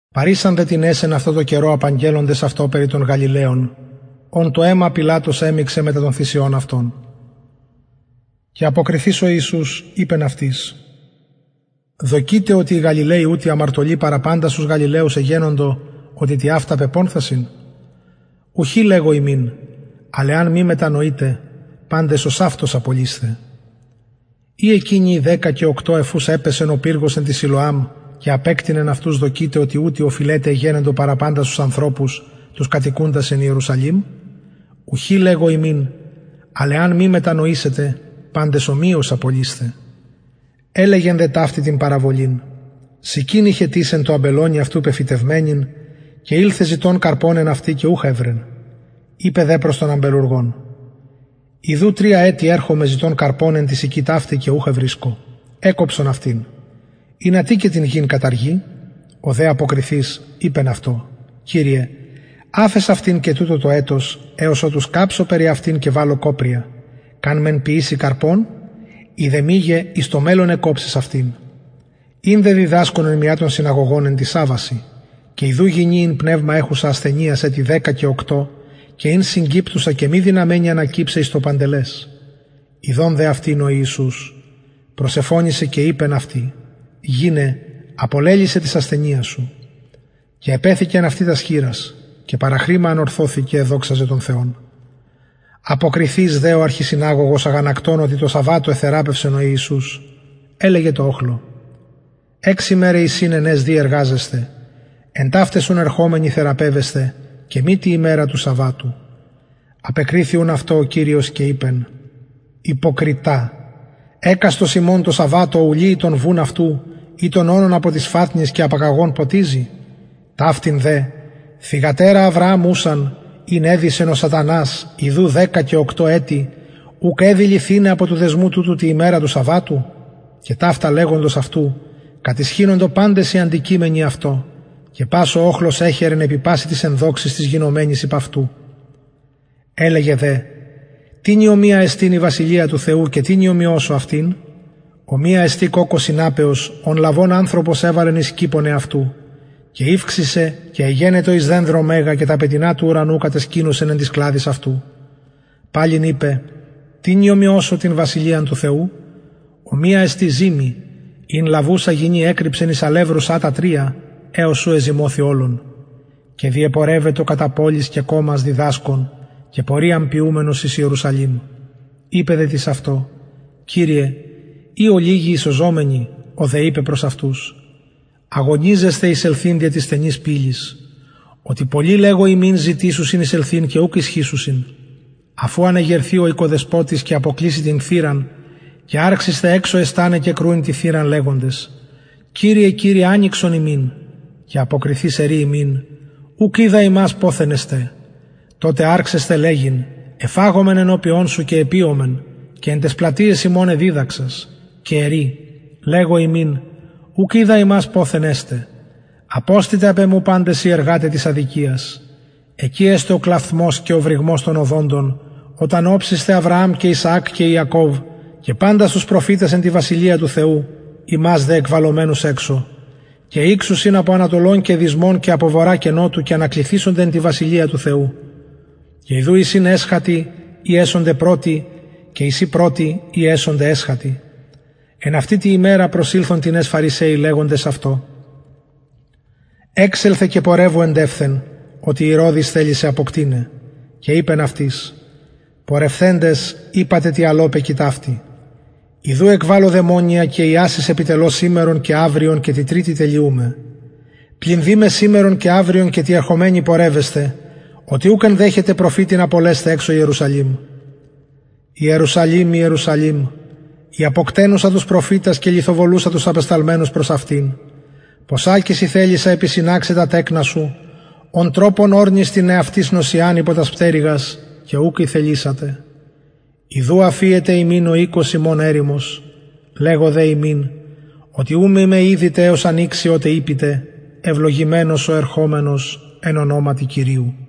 παρησαν δε τινες εν αυτω τω καιρω απαγγελλοντες αυτω περι των γαλιλαιων ων το αιμα πιλατος εμιξεν μετα των θυσιων αυτων και αποκριθεις ο ιησους ειπεν αυτοις δοκειτε οτι οι γαλιλαιοι ουτοι αμαρτωλοι παρα παντας τους γαλιλαιους εγενοντο οτι τοιαυτα πεπονθασιν ουχι λεγω υμιν αλλ εαν μη μετανοητε παντες ωσαυτως απολεισθε η εκεινοι οι δεκα και οκτω εφ ους επεσεν ο πυργος εν τω σιλωαμ και απεκτεινεν αυτους δοκειτε οτι ουτοι οφειλεται εγενοντο παρα παντας ανθρωπους τους κατοικουντας εν ιερουσαλημ ουχι λεγω υμιν αλλ εαν μη μετανοητε παντες ομοιως απολεισθε ελεγεν δε ταυτην την παραβολην συκην ειχεν τις εν τω αμπελωνι αυτου πεφυτευμενην και ηλθεν ζητων καρπον εν αυτη και ουχ ευρεν ειπεν δε προς τον αμπελουργον ιδου τρια ετη ερχομαι ζητων καρπον εν τη συκη ταυτη και ουχ ευρισκω εκκοψον αυτην ινα τι και την γην καταργει ο δε αποκριθεις λεγει αυτω κυριε αφες αυτην και τουτο το ετος εως οτου σκαψω περι αυτην και βαλω κοπρια καν μεν ποιηση καρπον ει δε μηγε εις το μελλον εκκοψεις αυτην ην δε διδασκων εν μια των συναγωγων εν τοις σαββασιν και ιδου γυνη ην πνευμα εχουσα ασθενειας ετη δεκα και οκτω και ην συγκυπτουσα και μη δυναμενη ανακυψαι εις το παντελες ιδων δε αυτην ο ιησους προσεφωνησεν και ειπεν αυτη γυναι απολελυσαι της ασθενειας σου και επεθηκεν αυτη τας χειρας και παραχρημα ανωρθωθη και εδοξαζεν τον θεον αποκριθεις δε ο αρχισυναγωγος αγανακτων οτι τω σαββατω εθεραπευσεν ο ιησους ελεγεν τω οχλω εξ ημεραι εισιν εν αις δει εργαζεσθαι εν ταυταις ουν ερχομενοι θεραπευεσθε και μη τη ημερα του σαββατου απεκριθη ουν αυτω ο κυριος και ειπεν υποκριται εκαστος υμων τω σαββατω ου λυει τον βουν αυτου η τον ονον απο της φατνης και απαγαγων ποτιζει ταυτην δε θυγατερα αβρααμ ουσαν ην εδησεν ο σατανας ιδου δεκα και οκτω ετη ουκ εδει λυθηναι απο του δεσμου τουτου τη ημερα του σαββατου και ταυτα λεγοντος αυτου κατησχυνοντο παντες οι αντικειμενοι αυτω και πας ο οχλος εχαιρεν επι πασιν τοις ενδοξοις τοις γινομενοις υπ αυτου ελεγεν δε τινι ομοια εστιν η βασιλεια του θεου και τινι ομοιωσω αυτην ομοια εστιν κοκκω σιναπεως ον λαβων ανθρωπος εβαλεν εις κηπον εαυτου και ηυξησεν και εγενετο εις δενδρον μεγα και τα πετεινα του ουρανου κατεσκηνωσεν εν τοις κλαδοις αυτου παλιν ειπεν τινι ομοιωσω την βασιλειαν του θεου ομοια εστιν ζυμη ην λαβουσα γυνη ενεκρυψεν εις αλευρου σατα τρια εως ου εζυμωθη ολον και διεπορευετο κατα πολεις και κωμας διδασκων και πορειαν ποιουμενος εις ιερουσαλημ ειπεν δε τις αυτω κυριε ει ολιγοι οι σωζομενοι ο δε ειπεν προς αυτους αγωνιζεσθε εισελθειν δια της στενης πυλης οτι πολλοι λεγω υμιν ζητησουσιν εισελθειν και ουκ ισχυσουσιν αφ ου αν εγερθη ο οικοδεσποτης και αποκλειση την θυραν και αρξησθε εξω εσταναι και κρουειν την θυραν λεγοντες κυριε κυριε ανοιξον ημιν και αποκριθεις ερει υμιν ουκ οιδα υμας ποθεν εστε τοτε αρξεσθε λεγειν εφαγομεν ενωπιον σου και επιομεν και εν ταις πλατειαις ημων εδιδαξας και ερει λεγω υμιν ουκ οιδα υμας ποθεν εστε αποστητε απ εμου παντες οι εργαται της αδικιας εκει εσται ο κλαυθμος και ο βρυγμος των οδοντων οταν οψησθε αβρααμ και ισαακ και ιακωβ και παντας τους προφητας εν τη βασιλεια του θεου υμας δε εκβαλλομενους εξω και ηξουσιν απο ανατολων και δυσμων και βορρα και νοτου και ανακλιθησονται εν τη βασιλεια του θεου και ιδου εισιν εσχατοι οι εσονται πρωτοι και εισιν πρωτοι οι εσονται εσχατοι εν αυτη τη ημερα προσηλθον τινες φαρισαιοι λεγοντες αυτω εξελθε και πορευου εντευθεν οτι ηρωδης θελει σε αποκτειναι και ειπεν αυτοις πορευθεντες ειπατε τη αλωπεκι ταυτη ιδου εκβαλλω δαιμονια και ιασεις επιτελω σημερον και αυριον και τη τριτη τελειουμαι πλην δει με σημερον και αυριον και τη εχομενη πορευεσθαι οτι ουκ ενδεχεται προφητην απολεσθαι εξω ιερουσαλημ ιερουσαλημ ιερουσαλημ η αποκτενουσα τους προφητας και λιθοβολουσα τους απεσταλμενους προς αυτην ποσακις ηθελησα επισυναξαι τα τεκνα σου ον τροπον ορνις την εαυτης νοσσιαν υπο τας πτερυγας και ουκ ηθελησατε ιδου αφιεται υμιν ο οικος υμων ερημος λεγω δε υμιν οτι ου μη με ιδητε εως αν ηξει οτε ειπητε ευλογημενος ο ερχομενος εν ονοματι κυριου